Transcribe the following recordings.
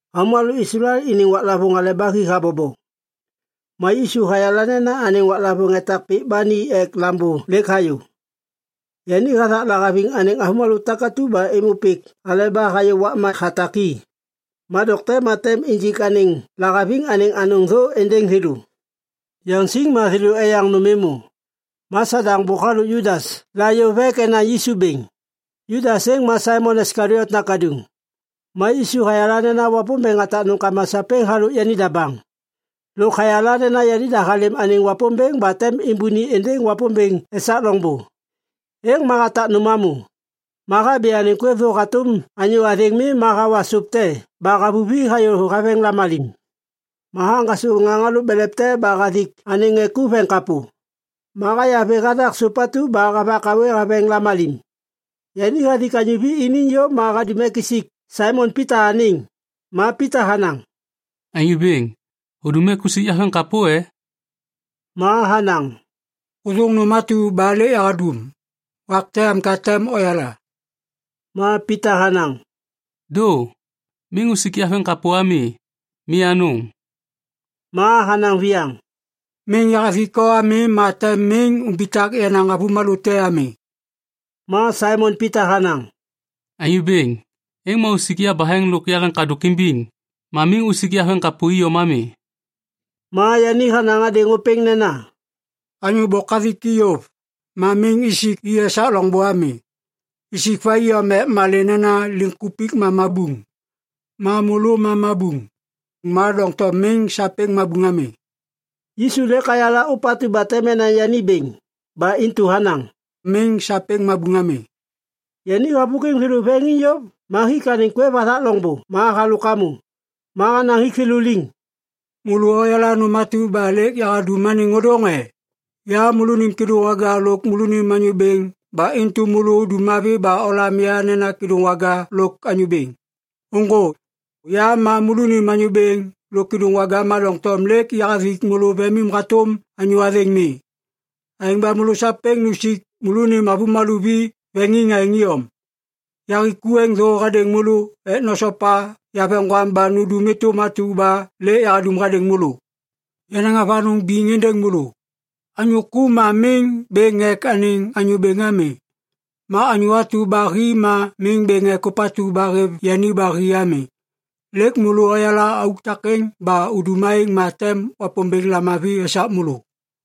Avômalô Islael iniŋ waklavôŋ Hale ba Hi habobo. Ma Yisu hayala nena anêŋ waklavôŋ etak pik ba ni ek Lambô lêk hayô. Yani hathak lahaviŋ anêŋ avômalô takatu ba êmô pik aleba hayô wakma hatak i. Ma dokte ma tem injik anêŋ lahaviŋ anêŋ anôŋ thô êndêŋ thêlô. Yaŋsiŋ ma thêlô eyaŋ nôm êmô. Ma Sadaŋ bôk halôk Judas la yôv ek enaŋ Yisu bêŋ. Judas êŋ ma Saimon Iskaliot nakaduŋ. Ma Yisu hayala nena Wapômbêŋ hatak nômkama sapêŋ halôk yanida baŋ. Lôk hayala nena yanida halêm anêŋ Wapômbêŋ ba tem êmbôni êndêŋ Wapômbêŋ esak loŋbô. Êŋ ma hatak nôm hamô. Ma habi anêŋ kwêv thô hatôm anyô athêŋ mi ma hawa sôp te ba havuvi hayô haveŋ lamalim. Ma haŋgasô ŋaŋ halôk belev te ba hathik anêŋ ŋê ku veŋiŋ kapô. Ma haya vê hathak sôp atu ba havak hawê haveŋ lamalim. Yani hathik anyô vi iniŋ yôv ma hadum ek isik Saimon Pita anêŋ. Ma Pita hanaŋ, “Anyô Bêŋ, hudum ek usik yaveŋkapô e?” Ma hanaŋ, “Hôthôŋ nôm atu ba lêk yahadum. Wak te am ka tem oyala.” Ma Pita hanaŋ, “Dô! Miŋ usik yaveŋkapô ami. Mi anôŋ.” Ma hanaŋ viyaŋ, “Miŋ yahathik o ami ma tem miŋ umbitak yenaŋ avômalô te ami.” Ma Saimon Pita hanaŋ, “Anyô Bêŋ, êŋ ma usik yabaheŋ lôk yaleŋkadôk imbiŋ ma miŋ usik yaveŋkapô iyom ami.” Ma yani hanaŋ hadêŋ ôpêŋ nena, “Anyô bôk hathik i yôv, ma miŋ isik i esak loŋbô ami. Isik va iyom ek malê nena liŋkupik ma mabuŋ. Ma môlô ma mabuŋ. Ma doŋtom miŋ sapêŋ mabuŋ ami.” Yisu lêk hayala ôpatu ba tem enaŋ yani bêŋ. Ba intu hanaŋ, “Miŋ sapêŋ mabuŋ ami.” Yani havôkwiŋ thêlô veŋiŋ yôv ma hik anêŋ kwêv hathak loŋbô ma halôk hamô. Ma hanaŋ hik thêlô liŋ, “Môlô oyala nôm atu ba lêk yahadum anêŋ ôdôŋ e? Ya môlônim Kêdôŋwaga lôk môlônim Anyô Bêŋ ba intu môlô udum mavi ba olam ya nena ‘Kêdôŋwaga’ lôk ‘Anyô Bêŋ’. Ôŋgô! Ya ma môlônim Anyô Bêŋ lôk Kêdôŋwaga ma doŋtom lêk yahathik môlô vemim hatôm anyô athêŋ mi. Aêŋ ba môlô sapêŋ nusik môlônim avômalô vi veŋiŋ aêŋ iyom. Yahik ku êŋ thô hadêŋ môlô ek nosopa yaveŋgwam ba nundum êtôm atu ba lêk yahadum hadêŋ môlô. Yanaŋ avanôŋ biŋ êndêŋ môlô. Anyô ku ma miŋ bêŋ ek anêŋ anyô bêŋ ami. Ma anyô atu ba hi ma miŋ bêŋ ek ôpatu ba hêv yani ba hi ami. Lêk môlô oyala auk takêŋ. Ba udum aêŋ ma tem Wapômbêŋ lamavi esak môlô.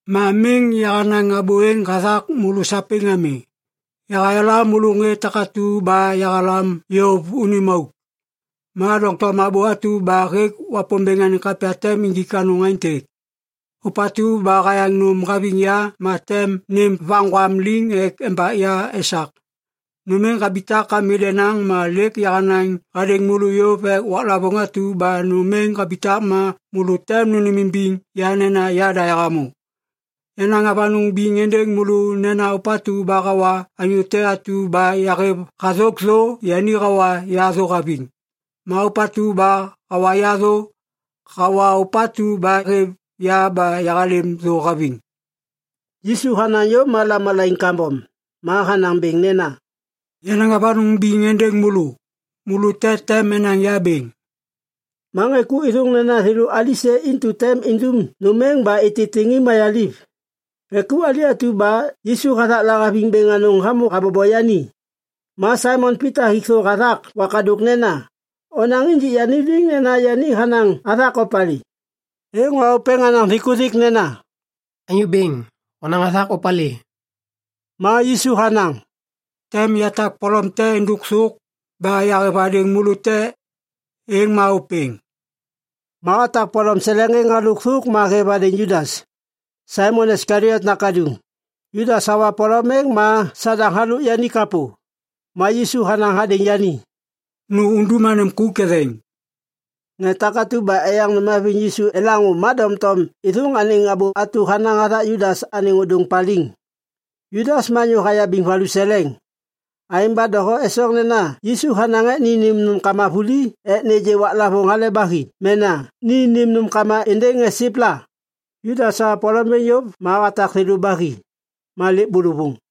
“Ma miŋ yahanaŋ abô êŋ hathak môlô sapêŋ ami. Yahayala môlô ŋê takatu ba yahalam yôv unim auk. Ma doŋtom abô atu ba hêk Wapômbêŋ anêŋ kapya tem injik anôŋ aêntêk, ‘Ôpatu ba hayaŋ nôm haviŋ ya ma tem nêm vaŋgwam liŋ ek embak ya esak.’ “Nôm êŋ habitak ami denaŋ ma lêk yahanaŋ hadêŋ môlô yôv ek waklavôŋ atu ba nôm êŋ habitak ma môlô tem nônêmimbiŋ ya nena Yada Yahamô. Yanaŋ avanôŋ biŋ êndêŋ môlô nena ôpatu ba hawa anyô te atu ba yahêv hathôk thô, yani hawa ya thô haviŋ. Ma ôpatu ba hawa ya thô, hawa Ôpatu ba hêv ya ba yahalêm thô haviŋ.” Yisu hanaŋ yôv ma lamalaiŋ kambom. Ma hanaŋ bêŋ nena, “Yanaŋ avanôŋ biŋ êndêŋ môlô. Môlô te tem enaŋ ya bêŋ!” Ma ŋê ku êthôŋ nena thêlô alisê intu tem indum nôm êŋ ba ititiŋ i mayaliv. Ŋê ku ali atu ba Yisu hathak lahaviŋ bêŋ anôŋ hamô habobo yani. Ma Saimon Pita hik thô hathak wakadôk nena, “Onaŋ injik yani liŋ nena yani hanaŋ hathak opalê.” Êŋ ma ôpêŋ hanaŋ thikuthik nena, “Anyô Bêŋ, honaŋ hathak opalê?” Ma Yisu hanaŋ, “Tem yatak polom te êndôk thôk ba yahêv hadêŋ môlô te. Êŋ ma ôpêŋ.” Ma hatak polom seleŋ êŋ halôk thôk ma hêv hadêŋ Judas, Saimon Iskaliot nakaduŋ. Judas hawa polom êŋ ma Sadaŋ halôk yani kapô. Ma Yisu hanaŋ hadêŋ yani, “Nu undum anêm ku ketheŋ.” Ŋê takatu ba eyaŋ nôm haviŋ Yisu elaŋô ma doŋtom êthôŋ anêŋ abô atu ba hanaŋ hathak Judas anêŋ ôdôŋ paliŋ. Judas ma anyô hayabiŋ valuseleŋ. Aêŋ ba doho esoŋ nena Yisu hanaŋ ek ni nêm nômkama vuli ek nêgê waklavôŋ Hale ba Hi mena ni nêm nômkama êndêŋ ŋê siv la. Judas hawa polom êŋ yôv ma hatak thêlô ba hi. Ma lêk bôlôvôŋ.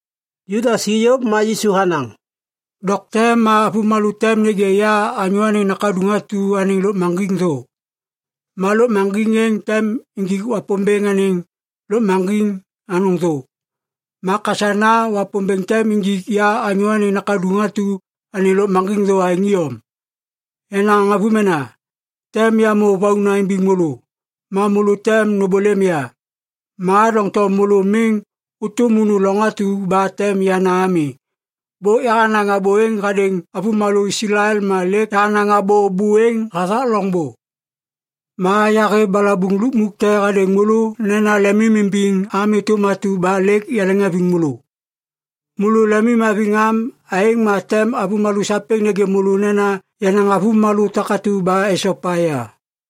Judas hi yôv ma Yisu hanaŋ, “Dokte ma avômalô tem nêgê ya Anyô Anêŋ Nakaduŋ atu anêŋ lôkmaŋgiŋ thô. Ma lôkmaŋgiŋ êŋ tem injik Wapômbêŋ anêŋ lôkmaŋgiŋ anôŋ thô. Ma kasana Wapômbêŋ tem injik ya Anyô Anêŋ Nakaduŋ atu anêŋ lôkmaŋgiŋ thô aêŋ iyom. “Yenaŋ avômena, tem yamô vauna imbiŋ môlô. Ma môlô tem nômbôlêm ya. Ma doŋtom môlô miŋ ôtôm unu loŋ atu ba tem yana ami. Bôk yahanaŋ abô êŋ hadêŋ avômalô Islael ma lêk yahanaŋ abô bô êŋ hathak loŋbô. “Ma yahêv balabuŋ lukmuk te hadêŋ môlô nena lemimimbiŋ am êtôm atu ba lêk yaleŋhaviŋ môlô. Môlô lemimhaviŋ am aêŋ ma tem avômalô sapêŋ nêgê môlô nena yenaŋ avômalô takatu ba esopa ya.”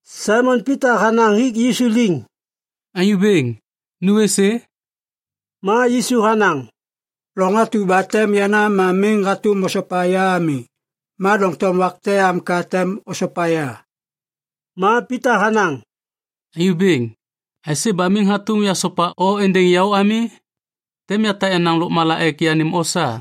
Saimon Pita hanaŋ hik Yisu liŋ, “Anyô Bêŋ, nu êsê?” Ma Yisu hanaŋ, “Loŋ atu ba tem yana ma miŋ hatôm osopa ya ami. Ma doŋtom wak te am ka tem osopa ya.” Ma Pita hanaŋ, “Anyô Bêŋ, aisê ba miŋ hatôm yasopa o êndêŋ yaô ami? Tem yatak yenaŋ lôkmala ek yanêm o sa!”